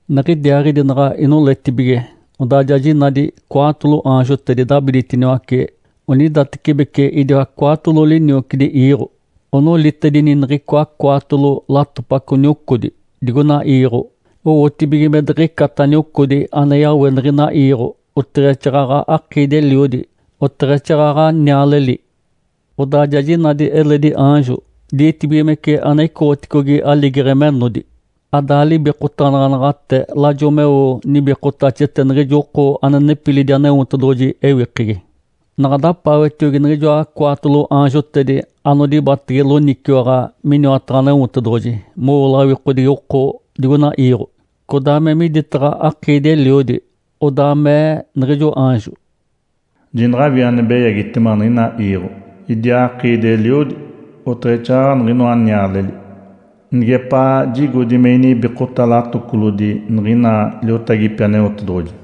Niɡ̶idiaaɡ̶idi naɡ̶a inoletibige, odaa ja jinadi cwaatolo aanjotedi dabiditiniwace onidatecibeci idiwa cwaatolo liniocidi iiɡ̶o. Onolitedini niɡ̶icoa cwaatolo latopaco niocodi digoina iiɡ̶o owotibige me diɡ̶icata niocodi ane yawe niɡ̶ina iiɡ̶o, oteɡ̶exaaɡ̶aɡ̶a akiidi-eliodi, oteɡ̶exaaɡ̶aɡ̶a nialeli. Odaa ja jinadi eledi aanjo ditibigimece ane icoɡ̶oticogi aligeɡ̶e menodi. Ada libikotanaɡ̶anaɡ̶ate lajo meo nibikotaxete niɡ̶ijo oko ane nepilidi Aneotedoɡ̶oji ewikegi. Naɡ̶a dapaawetiogi niɡ̶ijoa cwaatolo aanjotedi anodibatege loniciwaɡ̶a miniwataɡ̶a Aneotedoɡ̶oji mowo lawikodigi oko digoina iiɡ̶o, codaa me miditaɡ̶a akiidi-eliodi. Odaa mee niɡ̶ijo aanjo, “Jinaɡ̶awii ane beyagitema niɡ̶ina iiɡ̶o, idiaa akiidi-eliodi, oteɡ̶exaaɡ̶aɡ̶a niɡ̶inoa nialeli, nigepaa jigodi me inibikota latocolodi niɡ̶ina liotagipi Aneotedoɡ̶oji.”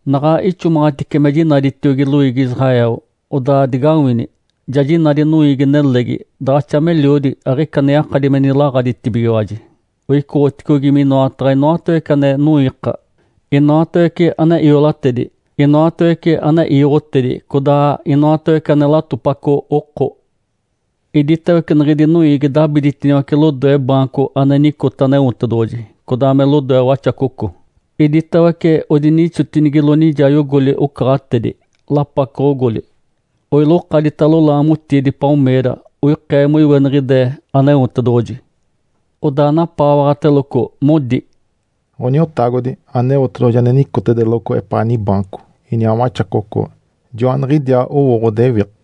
Naɡ̶a ixomaɡ̶atice me jinaditiogi loiigi Israel, odaa digawini! Ja jinadi noiigi-nelegi, daɡ̶axa meliodi aɡ̶ica ane yakadi me nilaɡ̶aditibigiwaji. Oicoɡ̶oticogi minoataɡ̶a inoatawece ane noiika, inoatawece ane iolatedi, inoatawece ane iiɡ̶otedi, codaa inoatawece ane latopaco oko. Iditawece niɡ̶idi noiigi dabiditiniwace lodoe baanco ane nicote Aneotedoɡ̶oji, codaa me lodoe Waxacoco. Iditawece odinixotinigilo nijayogoli ocaɡ̶atedi, lapacoɡ̶ogoli. Oilokaditalo laamotiidi “palmeira”. (Oikee moiweniɡ̶ide Aneotedoɡ̶oji). Odaa napaawaɡ̶ateloco, modi, “Ǥoniotagodi Aneotedoɡ̶oji ane nicotedeloco epaa nibaanco, iniaa Waxacoco, joaniɡ̶idiaa owo ɡ̶odewiɡ̶a.”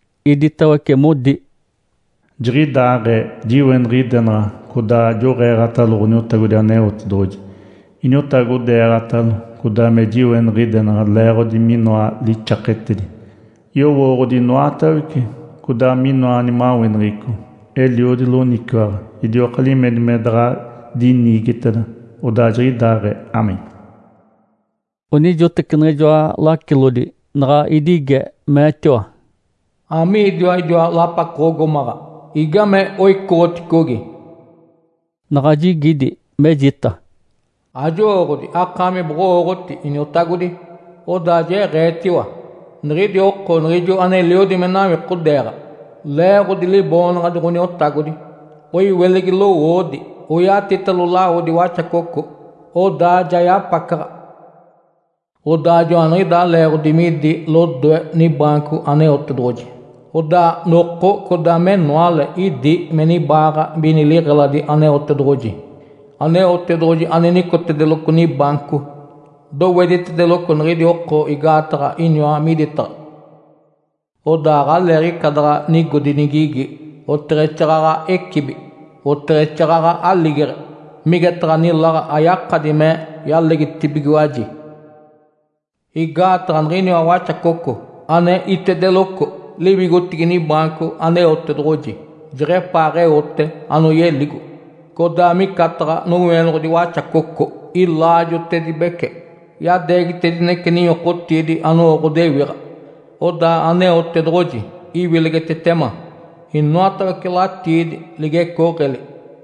Iditawece modi, “Jiɡ̶idaaɡ̶ee. Jiweniɡ̶idenaɡ̶a codaa joɡ̶eeɡ̶atalo Ǥoniotagodi Aneotedoɡ̶oji. Iniotagodeeɡ̶atalo, codaa me jiweniɡ̶idenaɡ̶a leeɡ̶odi minoa lixaketedi, yowooɡ̶odi inoatawece, codaa minoa nimaweneɡ̶eco, eliodi loniciwaɡ̶a. Idioka limedi me daɡ̶a diniigiteda. Odaa jiɡ̶idaaɡ̶ee. (Amém).” Onijoteci niɡ̶ijoa lacilodi naɡ̶a idige, meetiwa, “Amiidiwa idiwa lapacoɡ̶ogomaɡ̶a? Igame oicoɡ̶oticogi?” Naɡ̶a jigidi, mejita, “Ajowooɡ̶odi. Akaami boɡ̶owooɡ̶oti, iniotagodi.” Odaa jeɡ̶eetiwa, “Niɡ̶idi oko niɡ̶ijo aneliodi me nawikodeeɡ̶a leeɡ̶odi Liboonaɡ̶adi Ǥoniotagodi. Oiwilegi lowoodi, oyatitalo lawodi Waxacoco, odaa ja yapacaɡ̶a. Odaa joaniɡ̶idaa leeɡ̶odi midi lodoe nibaanco Aneotedoɡ̶oji. Odaa noko codaa menoale idi me nibaaɡ̶a mini liɡ̶eladi Aneotedoɡ̶oji. Aneotedoɡ̶oji ane nicotedeloco nibaanco doweditedeloco niɡ̶idi oko igaataɡ̶a iniwa miditaɡ̶a. Odaa aɡ̶aleeɡ̶ica daɡ̶a nigodi nigigi, oteɡ̶exaaɡ̶aɡ̶a ecibi, oteɡ̶exaaɡ̶aɡ̶a aligeɡ̶e, migetaɡ̶a niláɡ̶a yakadi me yalegitibigiwaji. Igaataɡ̶a niɡ̶iniwa Waxacoco ane itedeloco liwigotigi nibaanco Aneotedoɡ̶oji jeɡ̶epaaɡ̶eote anoyeligo, codaa micataɡ̶a nowienoɡ̶odi Waxacoco ilaajotedibece, yadeegitedinece ninyokotiidi anowo ɡ̶odewiɡ̶a. Odaa Aneotedoɡ̶oji iwilegitetema inoatawece latiidi ligecooɡ̶eli.”